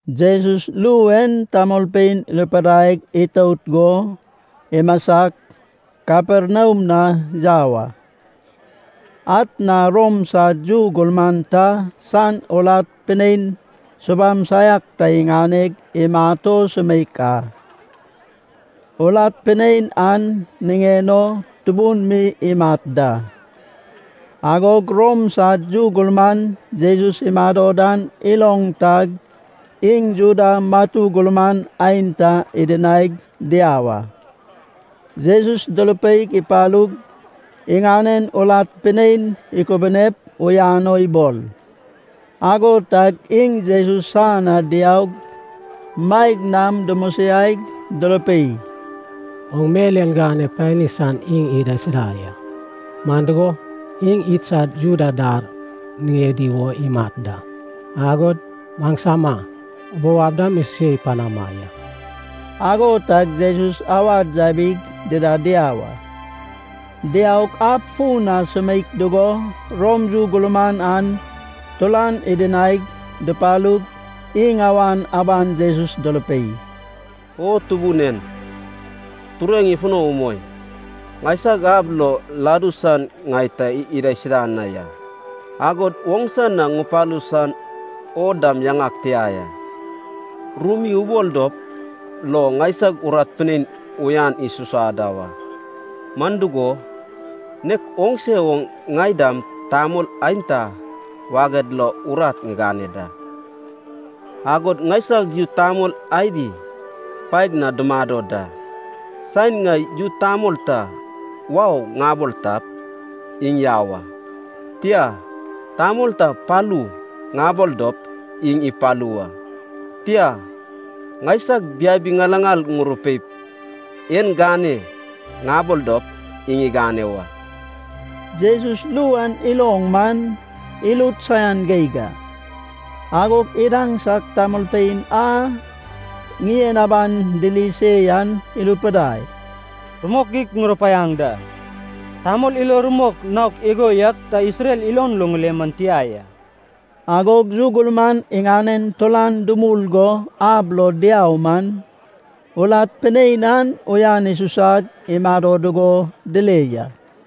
Jesus ru en tamolpein irupidai itout go, imasag, Kaperniam na yau a. Atna Rom san yu gurman ta san urat pinein subam saiak ta iŋaneg imat o sumeik a. Urat pinein an niŋen o tubun mi imat da. Agog Rom san yu gurman Jesus imado dan iloŋ tag, iŋ Juda matu gurman aenta idinaig diau a. Jesus durupeip ipalup, iŋanen urat pinein ikubunep uyan o ibol. Ago tag iŋ Jesus san na diaug, maeg nam dumosiaig durupei, “Oŋ mel en gane pani san iŋ idaisuda ya. Man dugo, iŋ idsad Juda dar niŋedi wo imat da, agod maŋsama ubou ab dam isuse panama ya.” Ago tag Jesus awad yabig dida diau a. Diaug ab fun na sumeik dugo Rom yu gurman an turan idinaig, dupalug, iŋ awan aban Jesus durupei, “O Tubun en, tureŋ ifuno umoi. Ŋaisag ab lo ladu san ŋai ta idaisuda na ya. Agod oŋsa na ŋupalu san o dam yaŋag tia ya. Ru mi ubol dop lo ŋaisag urat pinein uyan isusa da wa. Man dugo, nek oŋse oŋ ŋai dam tamol aenta waged lo urat ŋigane da, agod ŋaisag yu tamol adi paeg na dumado da. Saen ŋai yu tamol ta ‘wau’ ŋabol tap, iŋ yau a. Tia, tamol ta ‘palu’ ŋabol dop, iŋ ipalu wa. Tia, ŋaisag biabi ŋilaŋal ŋurupeip ‘en gane’ ŋabol dop, iŋ igane wa.” Jesus ru an iloŋ man, irut saian geig a. Agog idaŋsag tamolpein a ŋien aban diri se yan irupidai, “Rumok geig ŋurupaiaŋ da, tamol ilo rumok naok igo yak ta Isrel ilon lo ŋile man tia ya.” Agog yu gurman iŋanen turan dumul go ab lo diau man, urat pinein an uyan isusag imado dugo dile ya.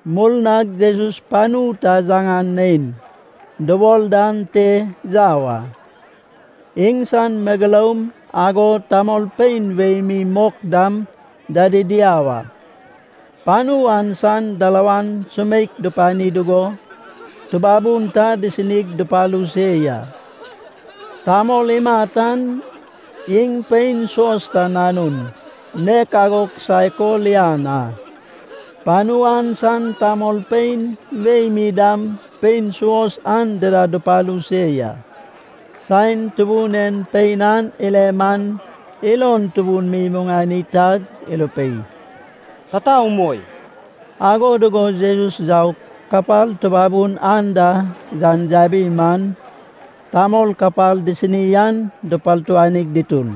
Murnag Jesus panu ta yaŋan Nein dubol dan te yau a. Iŋsan megeloum, agod tamolpein wei mi mok dam dadi diau a. Panu an san dalawan sumeik dupani dugo, tubabun ta disinig dupalu se ya. Tamol imat an iŋ pein suos ta nanun, nek ago kisaek o lian a. Panu an san tamolpein wei mi dam pein suos an dida dupalu se ya. Saen Tubun en pein an ile man, ilon tubun mi imuŋani tag irupei, “Tata umoi.” Ago dugo Jesus yaug, kapal tubabun anda yan yabi man, tamol kapal disini an dupartuanig dutur.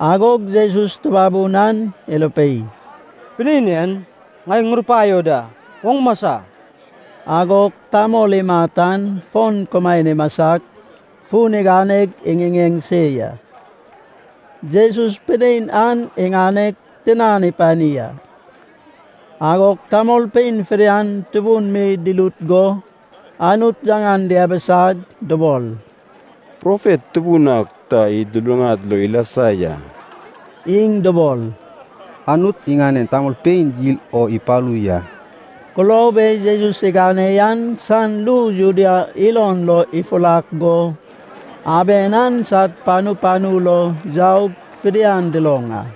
Agog Jesus tubabun an irupei, “Pinein en, ŋai ŋurupaio da, oŋ masa!” Agog tamol imat an fon kumaen imasag fun iganeg iŋiŋeŋ se ya. Jesus pinein an iŋaneg tinan ipani a. Agog tamolpein fidian tubun mi durut go, Anut yaŋan diabisag, dubol, “Profet tubun ak ta id luluŋad lo ilasa ya.” Iŋ dubol, “Anut iŋanen tamolpein yil o ipalu ya.” Kulob e Jesus igane yen san ru Judea ilon lo ifurak go, aben an sad panu panu lo yaug fidian duloŋ a.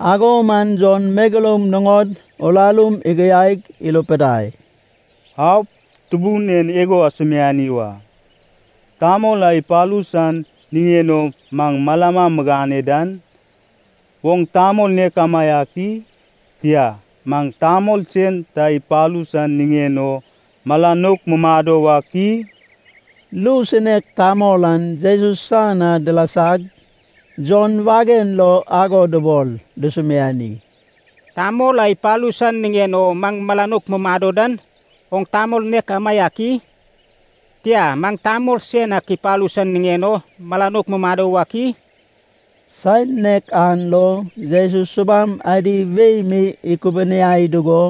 Ago man Jon megeloum nuŋod urarum igiaig irupidai, “Aup, Tubun en igo asumiani wa. Tamol a ipalu san niŋen o maŋ malama migane dan, oŋ tamol nek amaiak i? Tia, maŋ tamol sen ta ipalu san niŋen o mala nouk mumado wak i?” Ru sinek tamol an Jesus san na dilasag Jon wagen lo ago dubol dusumiani, “Tamol a ipalu san niŋen o maŋ mala nouk mumado dan, oŋ tamol nek amaiak i? Tia, maŋ tamol sen ak ipalu san niŋen o mala nouk mumado wak i?” Saen nek an lo, Jesus subam adi wei mi ikubuniai dugo,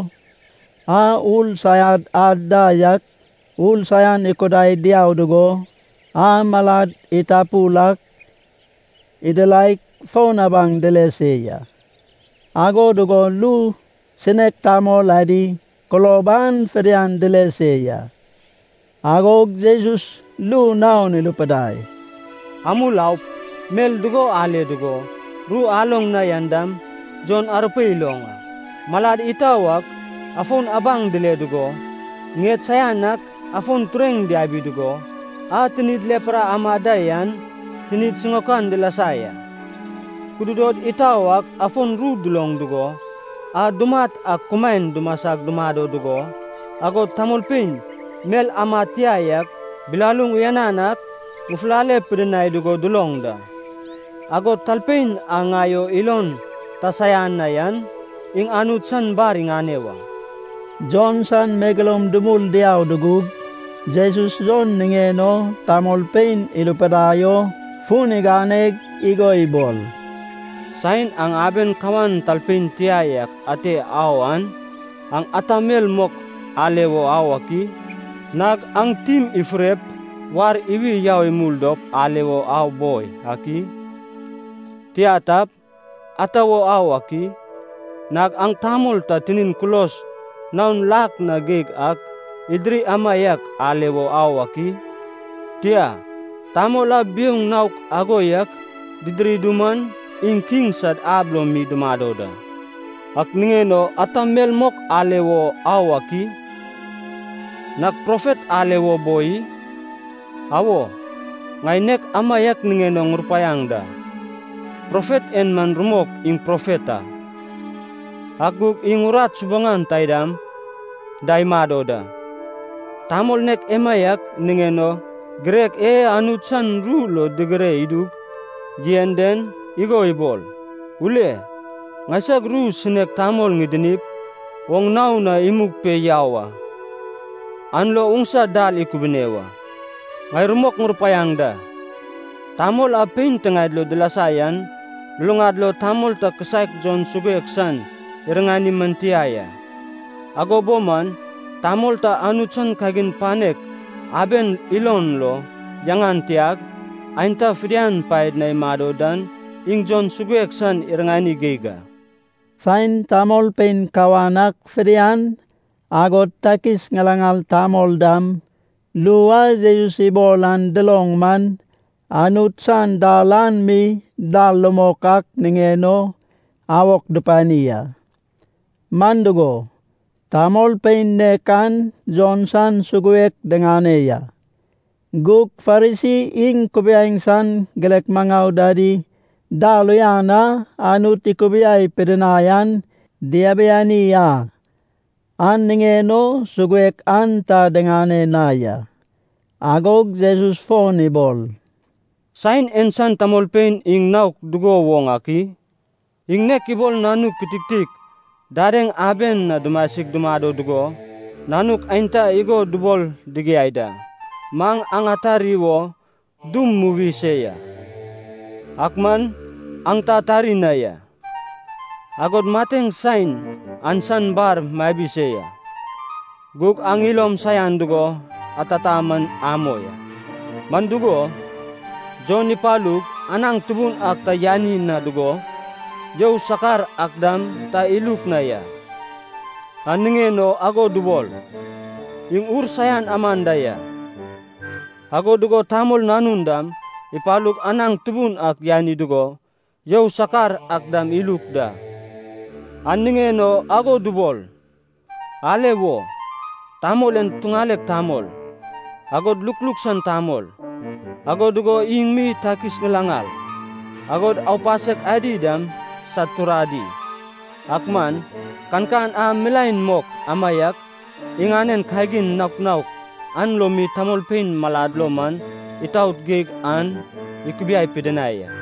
a ur saian ad da yak ur saian ikudai diau dugo, a malad itapul ak idiraig fon abaŋ dile se ya. Ago dugo ru sinek tamol adi kulob an fidian dile se ya. Agog Jesus ru naon irupidai, “Amul aup mel dugo ale dugo, ru aloŋ na yan dam Jon arupeip iloŋ a: malad itau ak afon abaŋ dile dugo, ŋied saian ak afon tureŋ diabi dugo, a tinid lepra amad da yan tinid siŋaokan dilasa ya. Kududod itau ak afon ru duloŋ dugo, a dumat ak kumaen dumasag dumado dugo, agod tamolpein mel amad tia yak bilaluŋ uyanan ak ŋufulale pidinai dugo duloŋ da. Agod talpein a ŋai o ilon ta saian na yan, iŋ Anut san bar iŋane wa.” Jon san megeloum dumul diau dugug, Jesus Jon niŋen o tamolpein irupidai o fun iganeg igo ibol, “Saen aŋ aben kawan talpein tia yak ate au an, aŋ ata mel mok ale wo au ak i? Nag aŋ tim ifurep war iwi yau imul dop ale wo au boi ak i? Tia tap, ata wo au ak i? Nag aŋ tamol ta tinin kulos naon lak na geig ak idiri amaiak ale wo au ak i? Tia, tamol a biouŋ naok ago yak didiri duman, iŋ kiŋ sad ab lo mi dumado da. Ak niŋen o ata mel mok ale wo au ak i? Nag profet ale wo boi i? Awo, ŋai nek amaiak niŋen o ŋurupaiaŋ da, profet en man rumok iŋ profet a, ak gug iŋ urat subaŋan taidam da imado da, tamol nek emaiak niŋen o girek e Anut san ru lo digire idug yen den, igo ibol, ‘Ule, ŋaisag ru sinek tamol ŋidinip, oŋ nao na imug pe yau a. An lo oŋsa dal ikubune wa.’ Ŋai rumok ŋurupaiaŋ da, tamol a pein tiŋaed lo dilasa yan luluŋad lo tamol ta kisaek Jon Suguek san iriŋani man tia ya. Ago bo man, tamol ta Anut san kagin panek aben ilon lo yaŋan tiag, aenta fidian paed na imado dan, iŋ Jon Suguek san iriŋani geig a.” (Saen tamolpein kawan ak fidian, agod takis ŋilaŋal tamol dam, ru a Jesus ibol an duloŋ man, Anut san dal an mi dal rumok ak niŋen o awok dupani a. Man dugo, tamolpein nek an Jon san suguek diŋane ya. Gug Farisi iŋ kubiaeŋ san girek maŋau dadi, dal uyan a Anut ikubiai pidinai an diabiani a. An niŋen o suguek an ta diŋane na ya.) Agog Jesus fon ibol, “Saen en san tamolpein iŋ naok dugo woŋ ak i? Iŋ nek ibol nanuk kititik dadeŋ aben na dumasig dumado dugo nanuk aenta igo dubol digiai da, ‘Maŋ aŋ atari wo dum muwi se ya, ak man aŋ ta atari na ya. Agod mateŋ saen an san bar mabi se ya, gug aŋ ilom saian dugo atata man amoi a.’ Man dugo, Jon ipalug anaŋ tubun ak ta yani na dugo, you sakar ak dam ta iluk na ya, an niŋen o ago dubol, ‘iŋ ur saiak aman da ya.’ Ago dugo Tamol Nanun dam ipalug anaŋ tubun ak yani dugo you sakar ak dam iluk da, an niŋen o ago dubol, ‘Ale wo, tamol en tuŋalek tamol, agod lukluk san tamol. Ago dugo iŋ mi takis ŋilaŋal, agod aupasek adi dam sad turadi!’ Ak man, kankan a milaen mok amaiak, iŋanen kagin naok naok an lo mi tamolpein malad lo man itaot geig an ikubiai pidinai a.”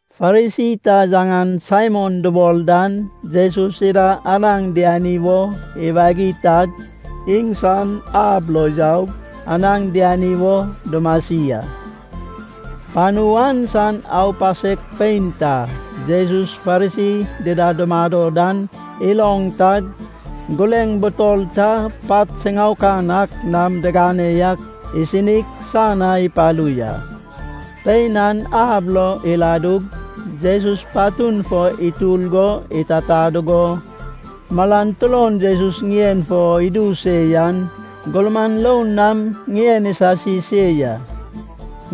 Farisi ta yaŋan Saimon dubol dan Jesus ida anaŋ diani wo iwagi tag iŋsan ab lo yaug, anaŋ diani wo dumasi a. Panu an san aupasek pein ta Jesus Farisi dida dumado dan iloŋ tag gureŋ, butol ta pat siŋaokan ak nam digane yak, isinig san na ipalu ya. Pein an ab lo iladug, Jesus patun fo itur go itata dugo, malan turon Jesus ŋien fo idu se yan, gurman roun nam ŋien isasi se ya.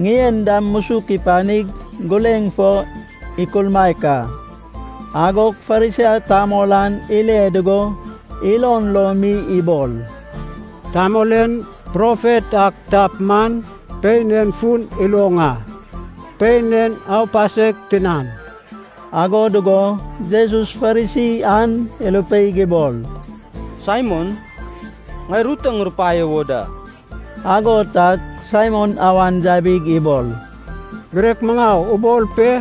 Ŋien dam musuk ipanig, gureŋ fo ikulmaek a. Agog Farisi tamol an ile dugo, ilon lo mi ibol, “Tamol en profet ak tap man pein en fun iloŋ a. Pein en aupasek tinan.” Ago dugo Jesus Farisi an irupeig ibol, “Saimon, ŋai ru ta ŋurupaio wo da.” Ago tag Saimon awan yabig ibol, “Girek maŋau, ubol pe.”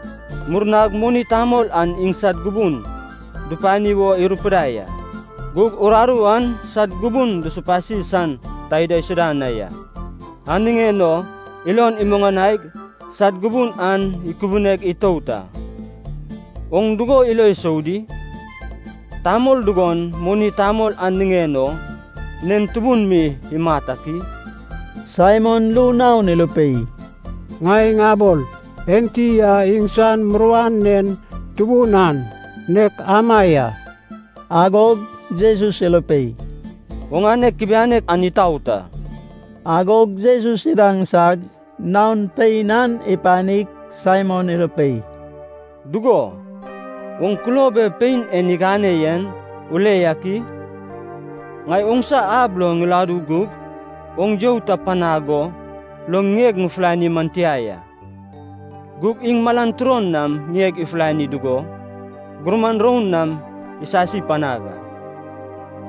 Murnag moni tamol an iŋsad gubun dupani wo irupidai a, gug uraru an sad gubun dusupasi san ta idaisuda na ya. An niŋen o ilon imuŋanaig sad gubun an ikubuneg itout a. Oŋ dugo ilo isou di? Tamol dugon, moni tamol an niŋen o, nen tubun mi imat ak i?” Saimon ru naon irupei, “Ŋai ŋabol, enti a iŋsan muruan nen tubun an, nek ama ya.” Agog Jesus irupei, “Oŋane kubianek an itaot a.” Agog Jesus idaŋsag, naon pein an ipanig Saimon irupei, “Dugo, oŋ kulob e pein en igane yen ule yak i? Ŋai oŋsa ab lo ŋiladu gug oŋ you ta panag go lo ŋieg ŋufulani man tia ya. Gug iŋ malan turon nam ŋieg ifulani dugo, gurman roun nam isasi panag a.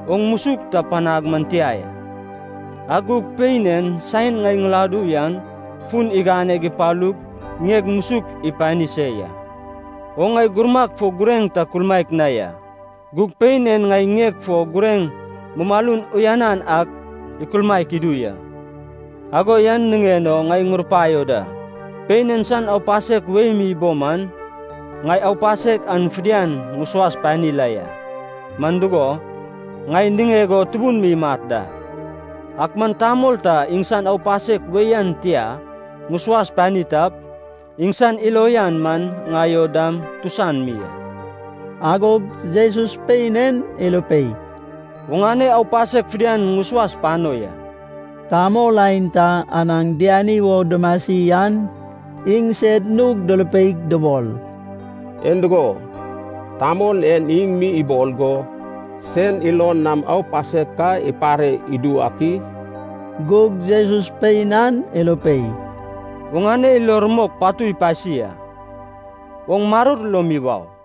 Oŋ musuk ta panag man tia ya, ak gug pein en saen ŋai ŋiladu yan fun iganeg ipalug ŋieg musuk ipani se ya. Oŋ ŋai gurmag fo gureŋ ta kulmaek na ya. Gug pein en ŋai ŋieg fo gureŋ mumalun uyanan ak ikulmaek idu ya. Ago yan niŋen o ŋai ŋurupaio da. Pein en san aupasek wei mi bo man, ŋai aupasek an fidian ŋusuas pani la ya, man dugo, ŋai niŋeg o tubun mi imat da. Ak man tamol ta iŋsan aupasek wei an tia ŋusuas pani tap, iŋsan ilo uyan man ŋai o dam tusan mi a.” Agog Jesus pein en irupei, “Oŋane aupasek fidian ŋusuas pano ya.” Tamol aenta anaŋ diani wo dumasi an iŋsed nug durupeig dubol, “En dugo, tamol en iŋ mi ibol go, sen ilon nam aupasek ka ipare idu wak i?” Gug Jesus pein an irupei, “Oŋane ilo rumok patu ipasi a. Oŋ maror lo mi wau.”